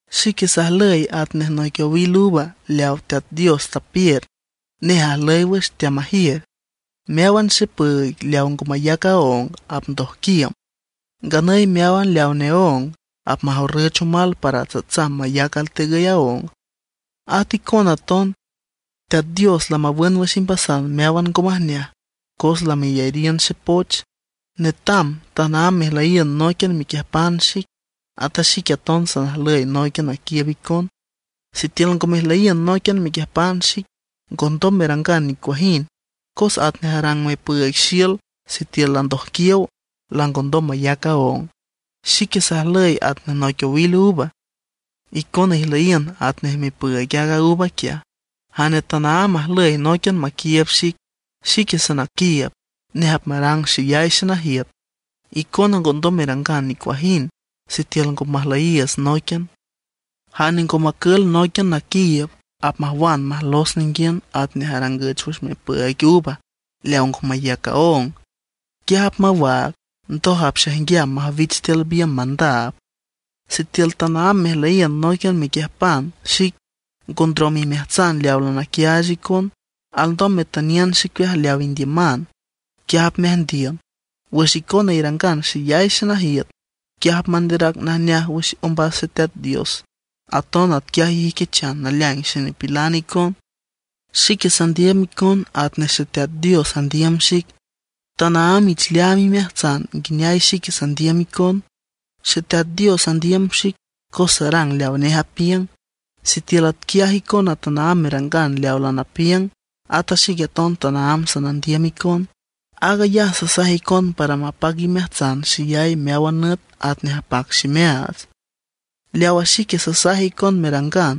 ’Xique sajlüy atnej noic owil uva leawa Teat Dios tapiür; nej ajlüy wüx, teamajiür. Meáwan xepüüig leaw ngo mayac aóng apmandojquiüm; nganüy meáwan leaw neóng apmajorrǘchan omal para tsatsam mayac altegüy aóng. At icona aton, Teat Dios lamawün wüx imbasan meáwan ngo majneaj, cos lameyariün xepoch. Netam tanaámb mejlüyiün nóiquian mequiüjpan xic; ata xique aton sanajlüy nóiquian naquiiüb icon. Sitiül ngo mejlüyiün nóiquian mequiüjpan xic, ngondom merangan nicuajind. Cos atnej arang mipüüig xiül sitiül landojquiow, langondom mayac aóng. ’Xique sajlüy atnej noic owil uva; icona ijlüyiün atnej mipüüig aaga uva quiaj. Jane tanaámb ajlüy nóiquian maquiiüb xic, xique sanaquiiüb; nej apmarang xeyay xenajiüt. Icona ngondom merangan nicuajind sitiül ngo majlüyiiüts nóiquian. Jane ngo macül nóiquian naquiiüb, apmajwan majlos ninguiün atnej arangüch wüx mipüüig uva leaw ngo mayac aong. Quiaj apmawaag, ndoj apxaijnguiam majwich tiül biümb mandaab. ’Sitiül tanaámb mejlüyiün nóiquian mequiüjpan xic, ngo ndrom imeajtsan leaw lanaquiaach icon, alndom metüniün xicueaj leaw indiüman, quiaj apmeajndiün. Wüx icona irangan xeyay xenajiüt, quiaj apmanderac najneajay wüx ombas Xeteat Dios; aton atquiaj ijüiquichan naleaing xenipilan icon. Xique sandiüm icon atnej Xeteat Dios andiüm xic. Tanaámb ich leaam imeajtsan nguineay xique sandiüm icon. Xeteat Dios andiüm xic cos sarang leawa nej apiüng. Sitiül atquiaj icona tanaámb merangan leaw lanapiüng, ata xique aton tanaámb sanandiüm icon. ’Aag ayaj sasaj icon para mapac imeajtsan xeyay meáwan nüt atnej apac ximeaats. Leawa xic sasaj icon merangan: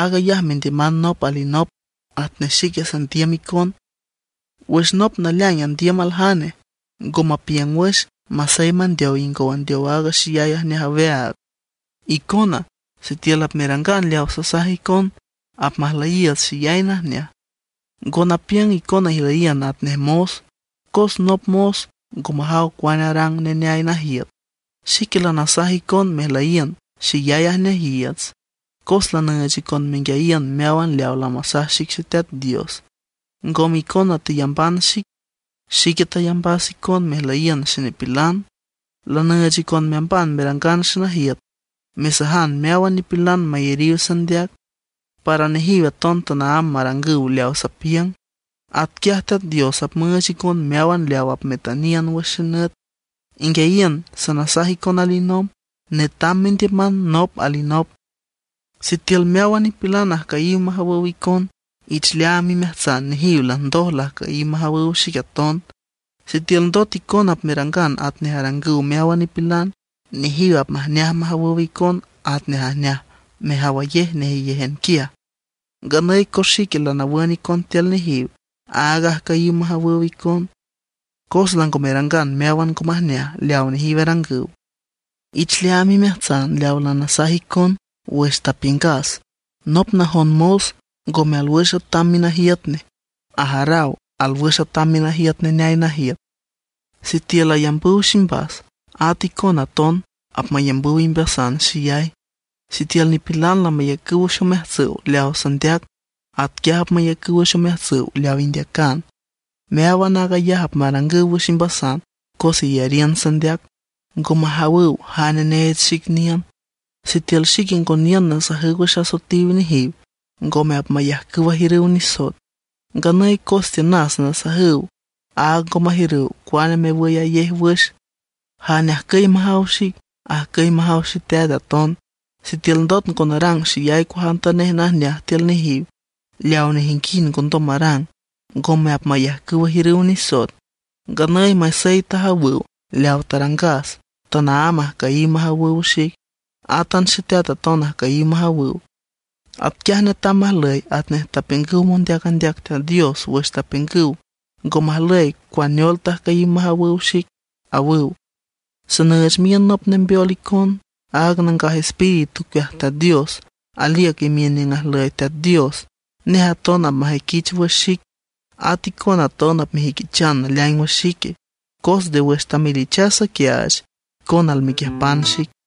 Aag ayaj mendiüman nop alinop atnej xique sandiüm icon. Wüx nop naleaing andiüm aljane, ngo mapiüng wüx, masey mandeow ingow andeow aaga xeyay ajneaj aweaag. Icona, sitiül apmerangan leawa sasaj icon, apmajlüyiiüts xeyay najneaj. Ngo napiüng icona ijlüyiün atnej mos, cos nop mos ngo majaw cuane arang neneay najiüt. Xique lanasaj icon mejlüyiün xeyay ajneajiiüts, cos lanüüch icon menguiayiün meáwan leaw lamasaj xic Xeteat Dios. Ngome icona teyamban xic, xique tayambas icon mejlüyiün xenipilan. Lanüüch icon meamban merangan xenajiüt mesajan meáwan nipilan mayariw sandeac, para nejiw aton tanaámb marangüw leaw sapiüng. Atquiaj Teat Dios apmüüch icon meáwan leaw apmetüniün wüx xenüt. Inguiayiün, sanasaj icon alinomb: Netam mendiüman nop alinop. ’Sitiül meáwan nipilan ajcüyiw majawüw icon, ich leaam imeajtsan nejiw landoj lajcüyiw majawüw xic aton. Sitiül ndot icona apmerangan atnej arangüw meáwan nipilan, nejiw apmajneaj majawüw icon atnej ajneaj mejawayej nejeyéjan quiaj. Nganüy cos xique lanawün icon tiül nejiw, áag ajcüyiw majawüw icon, cos lango merangan meáwan ngo majneaj leaw nejiw arangüw. Ich leaam imeajtsan leaw lanasaj icon wüx tapiüngas: “Nop najon mos ngome alwüx atam minajiüt nej; ajaraw alwüx atam minajiüt neneay najiüt.” Sitiül ayambüw ximbas, ata icona aton apmayambüw imbasan xeyay. Sitiül nipilan lamayacüw wüx omeajtsüw leawa sandeac, atquiaj apmayacüw wüx omeajtsüw leaw indeacan. Meáwan aag ayaj apmarangüw wüx imbasan cos iyariün sandeac. Ngo majawüw jane neech xic niün. ’Sitiül xique ngo niün nasajüw wüx asoetiw nejiw, ngome apmayajcüw ajiürüw nisoet. Nganüy cos tiünas nasajüw, áag ngo majiürüw cuane mewüyayej wüx. Jane ajcüy majaw xic, ajcüy majaw Xeteat aton. Sitiül ndot ngo narang xeyay cuajantanej najneaj tiül nejiw, leaw nejinguind ngondom marang, ngome apmayajcüw ajiürüw nisoet. Nganüy masey tajawüw leawa tarangas, tanaámb ajcüyiw majawüw xic, átan Xeteat aton ajcüyiw majawüw. Atquiaj netam majlüy atnej tapiüngüw mondeac andeac Teat Dios wüx tapiüngüw: “Ngo majlüy cuaneol tajcüyiw majawüw xic”, awüw. ’Sanüüch miün nop nembeol icon, aaga Nangaj Espíritu ocueaj Teat Dios. Aliüc imiün niüng ajlüy Teat Dios. Nej aton apmajüiquich wüx xic. At icona aton apmejüiquichan naleaing wüx xique, cos nde wüx tamelichas saquiaach, icona almequiüjpan xic.